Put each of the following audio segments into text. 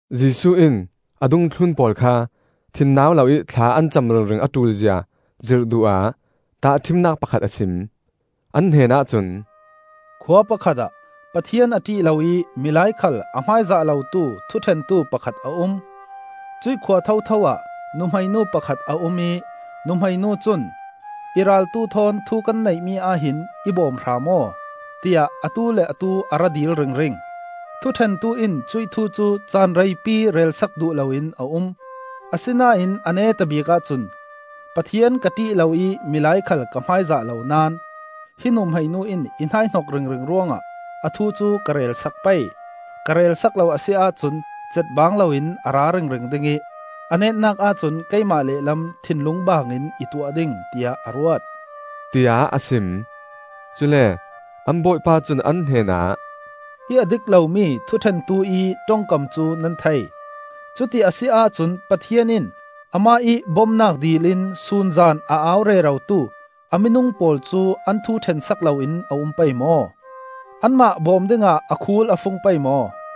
Jesuh in a dungthlun pawl kha thinnau loih thla an cam ringring a ṭulzia zirh duh ah tahṭhimnak pakhat a sim. An hnenah cun, “Khua pakhat ah Pathian a ṭih loih milai khal a hmaizah lotu thuṭhentu pakhat a um. Cuih khua thotho ah nuhmei nu pakhat a um ih nuhmei nu cun, ‘I raltu thawn thu kan neihmi ahhin i bawm hram aw,’ tiah atu le atu a ra dil ringring. Thuṭhentu in cuih thu cu caan reipi relsak duh loin a um; asinain a netabik ahcun ‘Pathian ka ṭih lo ih mi khal ka hmaizah lo naón, hi nuhmei nu in i hnaihnok ringring ruangah a thu cu ka relsak pei. Ka relsak lo a si ahcun catbang loin a ra ringring ding ih a netnak ahcun keimah lehlam thinlung baangin i tuah ding,’ tiah a ruat,” tiah a sim. Cule an Bawipa cun an hnenah, “Hi a dik lomi thuṭhentu ih ṭongkam cu nan thei! Cuti a si ahcun Pathian in amah ih bomnak dilin sun zan a au rerotu a minung pawl cu an thu ṭhensak loin a um pei maw? Anmah bawm dingah a khul a fung pei maw?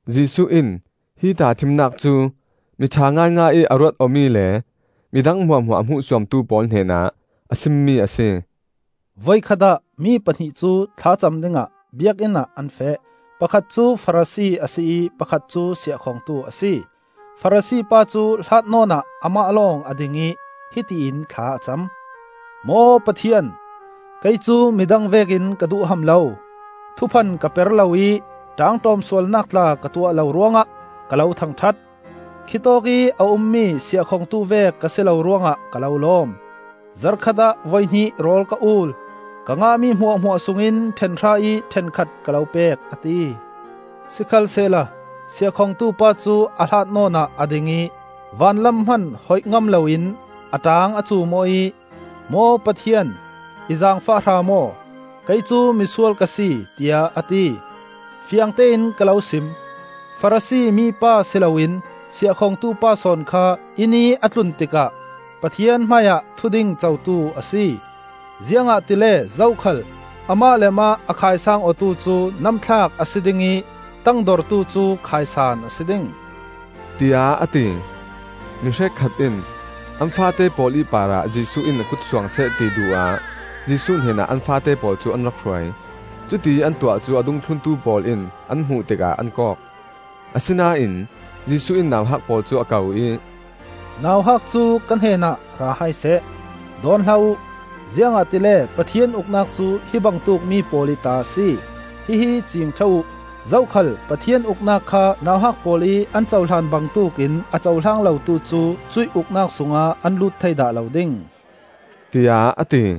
Jesuh in hi tahṭhimnak cu, miṭha ngaingai ih a ruat awmi le midang hmuahhmuah a hmuhsuamtu pawl hnenah a simmi a si. “Voikhat ah mi pahnih cu thlacam dingah Biakinn ah an feh. Pakhat cu Farasi a si ih pakhat cu siahkhongtu a si. Farasi pa cu hlat nawnah amah lawng a ding ih hiti in thla a cam. ‘Maw Pathian, kei cu midang vekin ka duhham lo, thuphan ka per lo ih ṭaangṭawm sualnak tla ka tuah lo ruangah ka lo thangṭhat. Khi tawkih a ummi siahkhongtu vek ka si lo ruangah ka lo lawm. Zarhkhat ah voihnih rawl ka ul, ka ngahmi hmuahhmuah sungin ṭhenhra ih ṭhenkhat ka lo pek,’ a ti. Sikhalsehla siahkhongtu pa cu a hlat nawn ah a ding ih vanlam hman hoih ngam loin a ṭaang a cuum aw ih ‘Maw Pathian, i zaangfah hram aw; kei cu misual ka si,’ tiah a ti. Fiangtein ka lo sim: Farasi mi pa si loin siahkhongtu pa sawn kha inn ih a tlun tikah Pathian hmaiah thuding cotu a si. Ziangahtile zokhal amah le amah a khaisang awtu cu namthlak a si ding ih tangdortu cu khaisan a si ding,” tiah a ti. Mi hrekkhat in an faate pawl ih parah Jesuh in a kut suangseh ti duh ah Jesuh hnenah an faate pawl cu an rak hruai. Cutiih an tuah cu a dungthluntu pawl in an hmuh tikah an kawk. Asinain Jesuh in nauhak pawl cu a ko ih, “Nauhak cu ka hnenah ra hai seh, dawn hlah uh; ziangahtile Pathian Uknak cu hi bangtuk mi pawl ih ta a si. Hihi ciing ṭha uh! Zokhal Pathian Uknak kha nauhak pawl ih an cohlan bangtuk in a cohlang lotu cu cuih Uknak sungah an lut thei dah lo ding,” tiah a ti.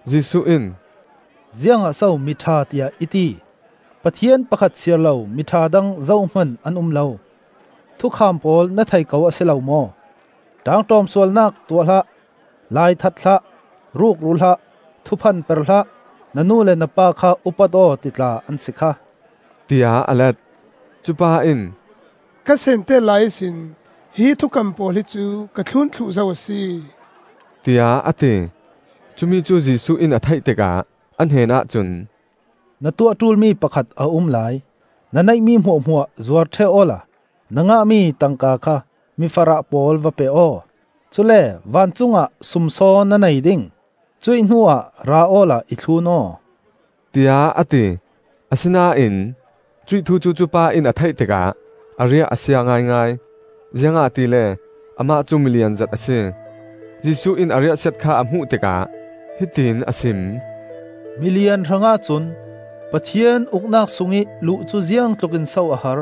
Jesuh in, “Ziangah so miṭha, tiah i ti? Pathian pakhat siarlo miṭha dang zohman an um lo. Thukham pawl na thei ko a si lo maw: ṭaangṭawm sualnak tuah hlah; lai that hlah; ruk ru hlah; thuphan per hlah; na nu le na pa kha upat aw,’ ti tla an si kha!” tiah a let. Cupa in, “Ka seentet lai ihsin hi thukam pawl hicu ka thlun thluh zo a si,” tiah a ti. Cumi cu Jesuh in a theih tikah a hnenah cun, “Na tuah ṭulmi pakhat a um lai. Na neihmi hmuahhmuah zuar ṭheh awla na ngahmi tangka kha mifarah pawl va pe aw; cule vancung ah sumsaw na nei ding. Cuih hnuah ra awla i thlun aw,” tiah a ti. Asinain cuih thu cu cupa in a theih tikah a riah a sia ngaingai, ziangahtile amah cu milianzet a si. Jesuh in a riahsiat kha a hmuh tikah hiti in a sim: “Milian hrangah cun Pathian Uknak sungih luh cu ziangtluk in so a har!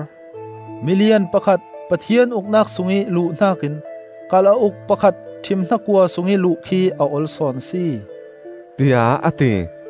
Milian pakhat Pathian Uknak sungih luh hnakin kalauk pakhat ṭhim hnakua sungih luh khi a ol sawn a si,” tiah a ti.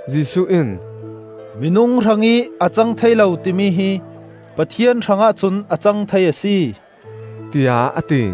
Jesuh in, “Minung hrangih a cang thei lo timi hi Pathian hrangah cun a cang thei a si,” tiah a ti.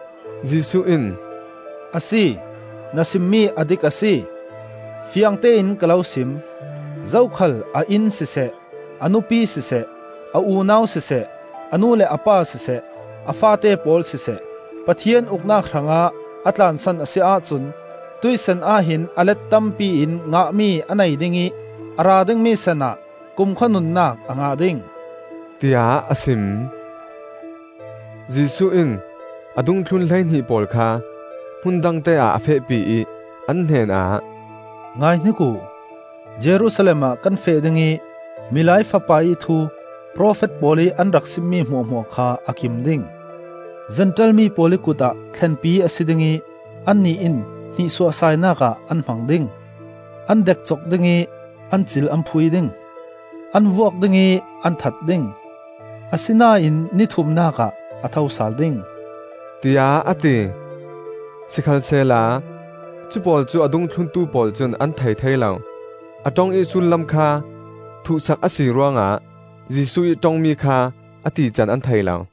Jesuh in, “Asi, na simmi a dik a si; fiangtein ka lo sim: zokhal a inn siseh, a nupi siseh, a unau siseh, a nu le a pa siseh, a faate pawl siseh, Pathian Uknak hrangah a tlansan a si ahcun, tuih san ahhin a let tampiin ngahmi a nei ding ih a ra dingmi san ah kumkhua nunnak a ngah ding,” tiah a sim. Jesuh in a dungthlun hleihnih pawl kha hmun dangte ah a fehpi ih an hnenah, “Ngaihnik uh! Jerusalem ah kan feh ding ih Milai Fapa ih thu profet pawl ih an rak simmi hmuahhmuah kha a kim ding. Zentail mi pawl ih kut ah thlenpi a si ding ih annih in hnihsuahsainak ah an hmang ding, an dekcok ding ih an cil an phui ding. An vuak ding ih an that ding, asinain ni thumnak ah a tho sal ding,” tiah a ti. Sikhalsehla cupawl cu a dungthluntu pawl cun an thei thei lo; a ṭong ih sullam kha thuhsak a si ruangah Jesuh ih ṭongmi kha a tican an thei lo.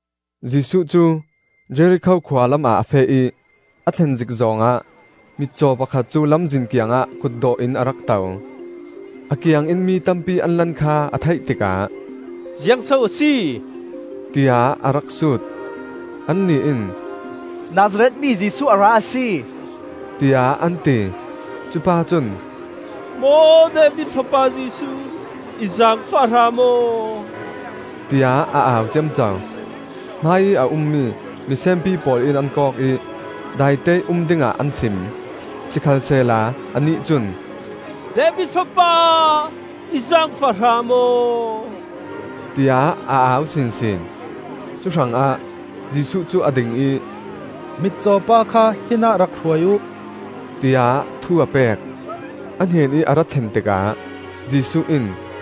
Jesuh cu Jerikho khua lamah a feh ih a thlen zik zawng ah mitcaw pakhat cu lamzin kiangah kutdawh in a rak to. A kiangin mi tampi an lan kha a theih tikah, “Ziang so a si?” tiah a rak sut. Annih in, “Nazareth mi Jesuh a ra a si,” tiah an ti. Cupa cun, “Maw David Fapa Jesuh, i zaangfah hram aw,” tiah a au ciamco. Hmaiih a ummi misenpi pawl in an kawk ih daiteih um dingah an sim. Sikhalsehla anih cun, “David Fapa, i zaangfah hrawm aw,” tiah a au sinsin. Cuhrangah Jesuh cu a ding ih, “Mitcaw pa kha hinah rak hruai uh,” tiah thu a pek. A hnenih a ra thlen tikah Jesuh in,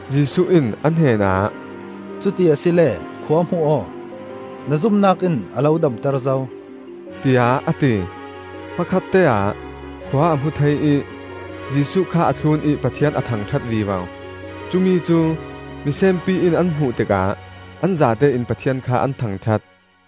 Jesuh in a hnenah, “Cuti asile khua hmu aw! Na zumnak in a lo damter zo,” tiah a ti. Hmakhatteah khua a hmu thei ih Jesuh kha a thlun ih Pathian a thangṭhat vivo. Cumi cu misenpi in an hmuh tikah an zatein Pathian kha an thangṭhat.